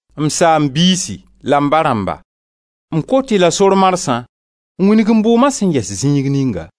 «M Saam-biisi la m ba rãmba m kot-y la sor marsã n wĩnig m bʋʋma sẽn yɛs zĩig ninga.»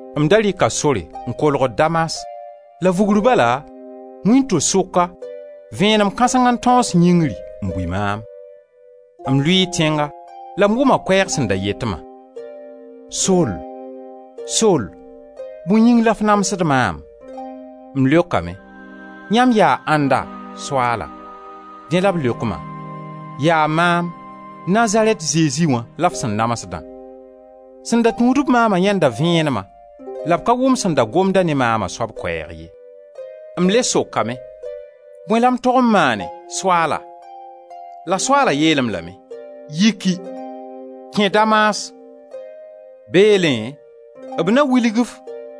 M da rɩka sore n kolgd Damas, la vugr bala, wĩnto-sʋka, vẽenem kãseng n tãoos yĩngri n bui maam. M lʋɩɩ tẽnga la m wʋma koɛɛg sẽn da yet ma: ‹Sol, Sol, bõe yĩng la f namsd maam?› M leokame: ‹Yãmb yaa ãnda, Soaala?› Dẽ la b leok ma: ‹Yaa maam, Nazarɛt Zezi wã, la f sẽn namsdã.› Sẽn da tũud-b maama yãenda vẽenema, la b ka wʋm sẽn da gomda ne maama soab koɛɛg ye. M le sokame: ‹Bõe la m tog n maane, Soaala?› La Soaala yeel-m lame: ‹Yiki! Kẽ Damas. Beelẽ b na wilg-f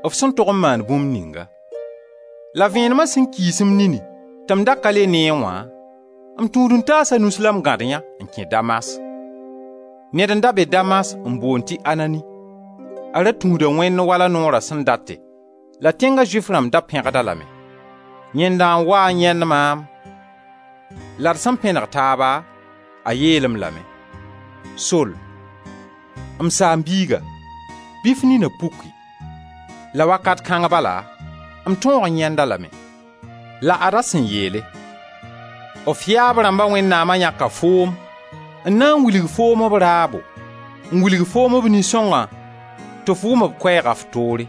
f sẽn tog n maan bũmb ninga.› La vẽenema sẽn kiis m nini tɩ m da ka le neẽ wã, m tũud-n-taasa nus la m gãd yã n kẽ Damas. Ned n da be Damas n boond tɩ Anani. A ra tũuda Wẽnd wala noora sẽn date la tẽnga Zʋɩf rãmb da pẽgd-a lame. Yẽnda n waa n yãend maam, la d sẽn pẽneg taaba, a yeel-m lame: ‹Sol, m saam-biiga, bɩ f nina puki.› La wakat kãng bala m tõog n yãend-a lame. La ad-a sẽn yeele: ‹D yaab rãmba Wẽnnaam yãka foom n na n wilg foom b raabo, n wilg foom b Nin-sõngã tɩ f wʋm b koɛɛgã f toore.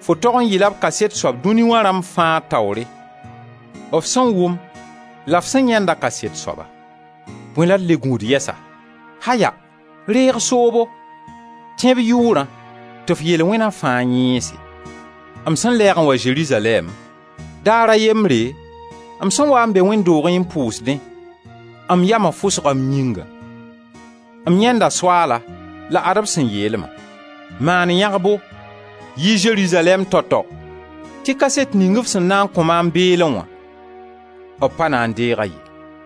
Fo tog n yɩ-la b kaset soab dũni wã rãmb fãa taoore, f sẽn wʋm la f sẽn yãenda kaset soaba. Bõe la d le gũud yɛsa? Aya! Reeg soobo, tẽ b Yʋʋrã tɩ f yel-wẽna fãa yẽese.› M sẽn lɛɛg n wa Zerizalɛɛm, daar a yembre, m sẽn waa n be wẽnd doogẽ n pʋʋsdẽ, m yama fʋsga m yĩngã. M yãenda Soaala, la ad-b sẽn yeel-ma: ‹Maan yãgbo, yi Zerizalɛɛm tao-tao, tɩ kaset ning f sẽn na n kõ maam beelẽ wã, b pa na n deeg-a ye.›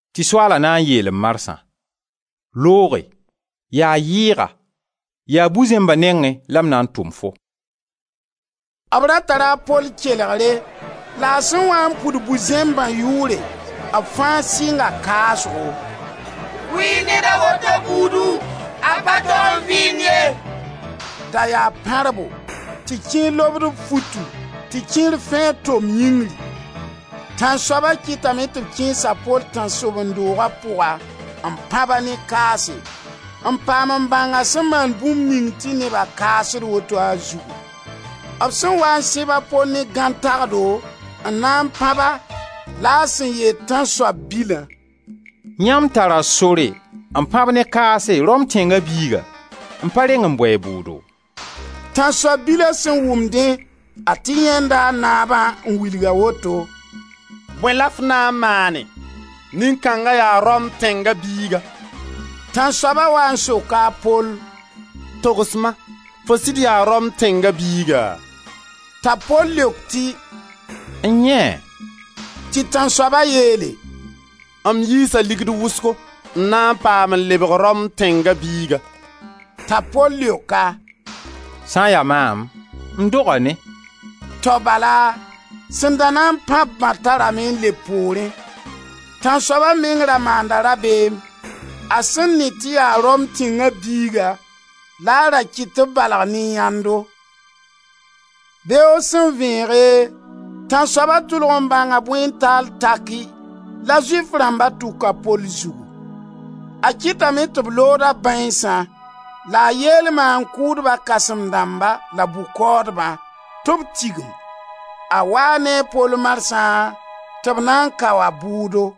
Tɩ Soaala na n yeel-m marsã: ‹Looge; yaa yɩɩga, yaa bu-zẽmba nengẽ la m na n tʋm-fo.›» B ra tara a Pol kelegre la a sẽn waa n pʋd bu-zẽmbã yʋʋre, b fãa sɩnga kaasgo: «Kʋ-y ned a woto buudu! A pa tog n vɩɩnd ye.» Da yaa pãrbo, tɩ kẽer lobd b futu, tɩ kẽer fẽed tom yĩngri. Tãnsoaba kɩtame tɩ b kẽes a Pol tãnsoben-dooga pʋga n pãb-a ne kaase, n paam n bãng a sẽn maan bũmb ning tɩ neba kaasd woto a zugu. B sẽn waa n sẽba Pol ne gãn tagdo n na n pãb-a la a sẽn yeel tãnsoab bilã: «Yãmb tara sore n pãb ne kaase Rom tẽnga biiga, n pa reng bʋ a bʋʋdo?» Tãnsoab bila sẽn wʋm dẽ, a tɩ yãenda a naabã n wilg-a woto: «Bõe la f na n maanẽ? Nin-kãnga yaa Rom tẽnga biiga.» Tãnsoaba waa n soka a Pol: «Togs-ma, fo sɩd yaa Rom tẽnga biiga?» T'a Pol leok tɩ: N-yẽe! Tɩ tãnsoaba yeele: «M yiisa ligd wʋsgo n na n paam n lebg Rom tẽnga biiga.» T'a Pol leok-a: «Sã n ya maam, m doga ne.» Tao bala sẽn da na n pãb-bã tarame n leb poorẽ. Tãnsoaba meng ra maanda rabeem, a sẽn ne tɩ yaa Rom tẽnga biiga la a ra kɩt tɩ b balg ne yãndo. Beoog sẽn vẽege, tãnsoaba tʋlg n bãnga bõe taale taki la Zʋɩf rãmba tʋk a Pol zugu. A kɩtame tɩ b lood a bãeensã la a yeel maan-kʋʋdba kãsem-dãmba la bʋ-kaoodbã, tɩ b tigim. A waa ne a Pol marsã tɩ b na n kao-a bʋʋdo.